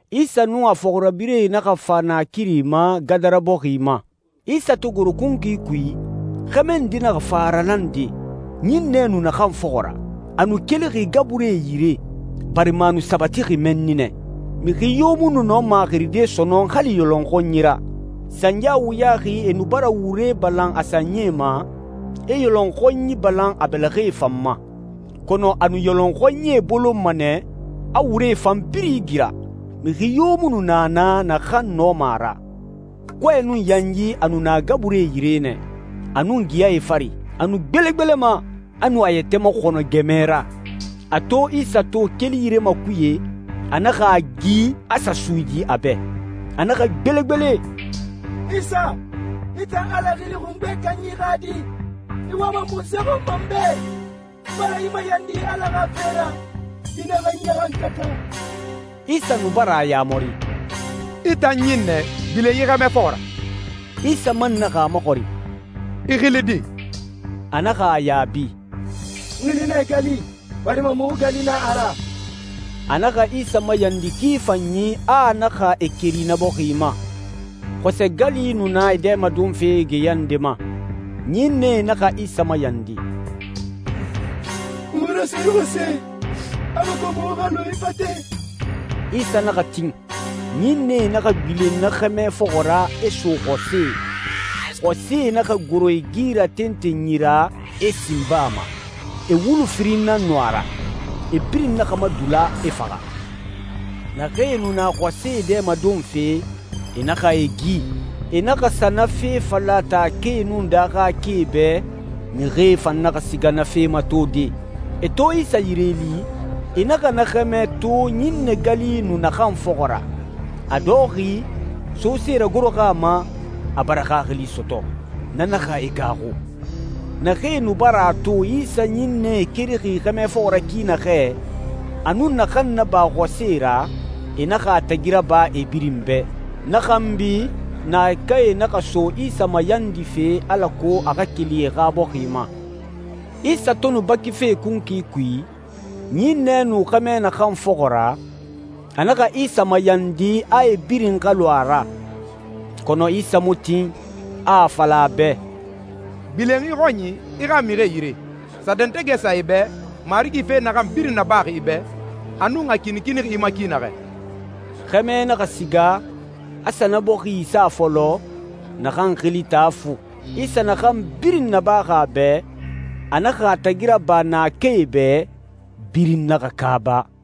Isa nun a fɔxirabirɛe naxa fa naakiri ma, Gadara bɔxi ma. Isa to goro kunkui kui, xɛmɛ nde naxa fa a ralande, ɲinnɛ nu naxan fɔxɔ ra. A nu kelixi gaburie yire, barima a nu sabatixi mɛnni nɛ. Mixi yo mu nu nɔma a xiride sɔnɔn, hali yɔlɔnxɔnyi ra. Sanya wuyaxi, e nu bara wure balan a sanyie ma, e yɔlɔnxɔnyi balan a bɛlɛxɛe fan ma. Kɔnɔ a nu yɔlɔnxɔnyie bolonma nɛ, a wuree fan birin igira. Mixi yo mu nu na naa naxan nɔma a ra. Kɔɛ nun yanyi a nu na gaburie yire nɛ, a nun geyae fari. A nu gbelegbelema, a nu a yɛtɛ maxɔnɔ gɛmɛ ra. A to Isa to keli yire makuye, a naxa a gi, a sa suyidi a bɛ. A naxa gbelegbele, «Isa, i tan Ala Xili Xungbe Kanyi xa Di, i wama munse xɔn ma n bɛ? N bara i mayandi Ala xa fe ra, i naxa n ɲaxankata.» Isa nu bara a yamari, «I tan ɲinnɛ, gbilen yi xɛmɛ fɔxɔ ra.» Isa man naxa a maxɔrin, «I xili di?» A naxa a yaabi, «N xili nɛ Gali, barima muxu gali nan a ra.» A naxa Isa mayandi ki fanyi, a a naxa e keri na bɔxi ma. Xɔsɛ gali nu na e dɛmadonfe geya nde ma. Ɲinnɛe naxa Isa mayandi, «Muxu raso yi xɔsɛe alako muxu xa lu e fate.» Isa naxa tin. Ɲinnɛe naxa gbilen na xɛmɛ fɔxɔ ra, e so xɔsɛe. Xɔsɛe naxa goro e gi ra tentenyi ra, e sin baa ma. E wulu firin nan nu a ra. E birin naxa madula, e faxa. Naxee nu na xɔsɛe dɛmadonfe, e naxa e gi. E naxa sa na fe fala taakae nun daaxakae bɛ, mixie fan naxa siga na fe matode. E to Isa yire li, e naxa na xɛmɛ to ɲinnɛ gali nu naxan fɔxɔ ra, a dɔxɔxi, sose ragoroxi a ma, a bara xaxili sɔtɔ. Na naxa e gaaxu. Naxee nu bara a to Isa ɲinnɛe kerixi xɛmɛ fɔxɔ ra ki naxɛ, a nun naxan naba xɔsɛe ra, e naxa a tagi raba e birin bɛ. Na xanbi, naakae naxa so Isa mayandife alako a xa keli e xa bɔxi ma. Isa to nu bakife kunkui kui, ɲinnɛe nu xɛmɛ naxan fɔxɔ ra, a naxa Isa mayandi a e birin xa lu a ra. Kɔnɔ Isa mu tin, a a fala a bɛ, «Gbilen i xɔnyi, i xa mixie yire. Sa dɛntɛgɛ sa e bɛ, Marigi fe naxan birin nabaxi i bɛ, a nun a kinikinixi i ma ki naxɛ.» Xɛmɛ naxa siga, a sa na bɔxi isa fɔlɔ, naxan xili Taa Fu. Isa naxan birin nabaxi a bɛ, a naxa a tagi raba naakae bɛ, birin naxa kaaba.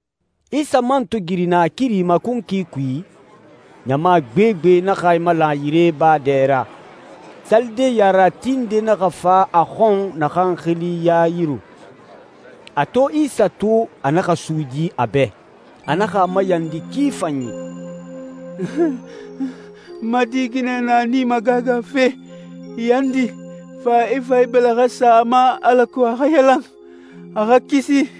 Isa man to giri naakiri ma kunkui kui, ɲama gbegbe naxa e malan a yire baa dɛ ra. Salide yarerati nde naxa fa a xɔn naxan xili Yayiru. A to Isa to, a naxa suyidi a bɛ. A naxa a mayandi ki fanyi, «N ma di ginɛ na a nii magagafe! Yandi, fa i fa i bɛlɛxɛ sa a ma alako a xa yalan, a xa kisi.»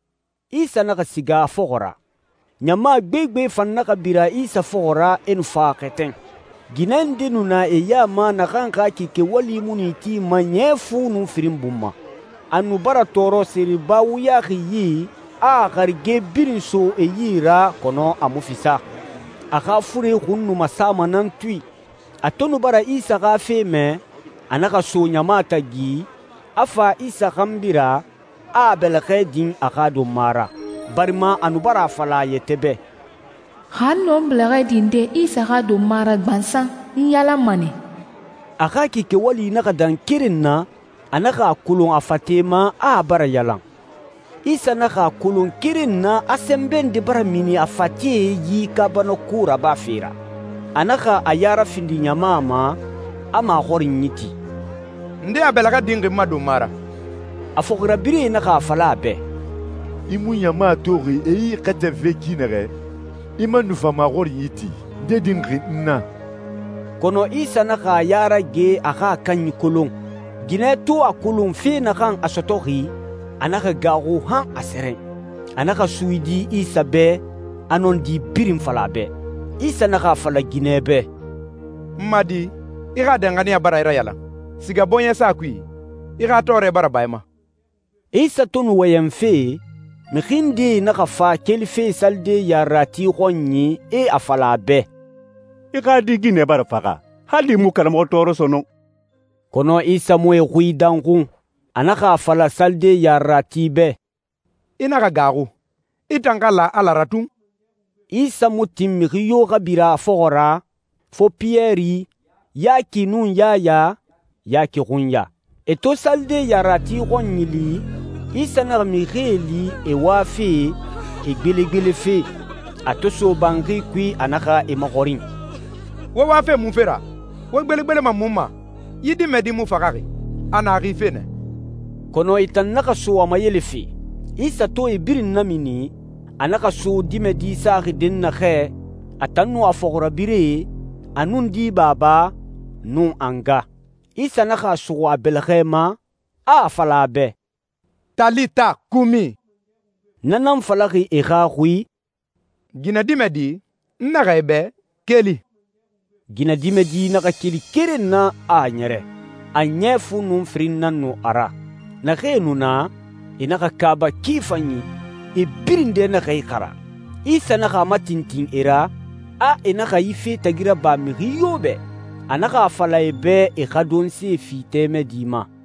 Isa naxa siga a fɔxɔ ra. Ɲama gbegbe fan naxa bira Isa fɔxɔ ra, e nu fa a xɛtɛn. Ginɛ nde nu na e ya ma naxan xa kike wali mu nu a itima ɲɛ fu nun firin bun ma. A nu bara tɔɔrɔ seriba wuyaxi yi, a a harige birin so e yi ra, kɔnɔ a mu fisa. A xa fure xun nu masama nan tui. A to nu bara Isa xa fe mɛ, a naxa so ɲama tagi, a fa Isa xanbi ra, a a bɛlɛxɛ din a xa donma ra. Barima a nu bara a fala a yɛtɛ bɛ, «Xa n nɔ n bɛlɛxɛ dinde Isa xa donma ra gbansan, n yalanma nɛ.» A xa kike wali naxa dan keren na, a naxa a kolon a fate ma a a bara yalan. Isa naxa a kolon keren na a sɛnbɛ nde bara mini a fate yi kaabanako rabafe ra. A naxa a ya rafindi ɲama ma, a maxɔrinyi ti, «Nde a bɛlɛxɛ dinxi n ma donma ra?» A fɔxirabirɛe naxa a fala a bɛ, «I mu ɲama toxi e i xɛtɛnfe ki naxɛ? I man nu fa maxɔrinyi ti, ‹Nde dinxi n na?›» Kɔnɔ Isa naxa a ya rage a xa a kanyi kolon. Ginɛ to a kolon fe naxan a sɔtɔxi, a naxa gaaxu han a sɛrɛn. A naxa suyidi Isa bɛ, a nɔndi birin fala a bɛ. Isa naxa a fala ginɛ bɛ, «N ma di, i xa danxaniya bara i rayalan. Siga bɔɲɛsa kui, i xa tɔɔrɛ bara ba i ma.» Isa to nu wɔyɛnfe, mixi ndee naxa fa kelife salide yarerati xɔnyi, e a fala a bɛ, «I xa di ginɛ bara faxa. Hali i mu karamɔxɔ tɔɔrɔ sɔnɔn.» Kɔnɔ Isa mu e xui danxun. A naxa a fala salide yarerati bɛ, «I naxa gaaxu. I tan xa la Ala ra tun.» Isa mu tin mixi yo xa bira a fɔxɔ ra, fo Piyɛri, Yaki, nun Yaya, Yaki xunya. E to salide yarerati xɔnyi li, Isa naxa mixie li, e wafe, e gbelegbelefe. A to so banxi kui, a naxa e maxɔrin, «Wo wafe munfe ra? Wo gbelegbelema mun ma? Yi dimɛdi mu faxaxi. A na xife nɛ.» Kɔnɔ e tan naxa so a mayelefe. Isa to e birin namini, a naxa so dimɛdi saxi dɛnnaxɛ, a tan nun a fɔxirabirɛe, a nun di baba, nun a nga. Isa naxa a suxu a bɛlɛxɛ ma, a a fala a bɛ, «Talita kumi». Na nan falaxi e xa xui, «Ginɛdimɛdi, n naxɛ i bɛ, keli!» Ginɛdimɛdi naxa keli keren na, a a ɲɛrɛ. A ɲɛ fu nun firin nan nu a ra. Naxee nu na, e naxa kaaba ki fanyi, e birin dɛ naxa ixara. Isa naxa a matintin e ra, a e naxa yi fe tagi raba mixi yo bɛ. A naxa a fala e bɛ e xa donse fi tɛmɛdi ma.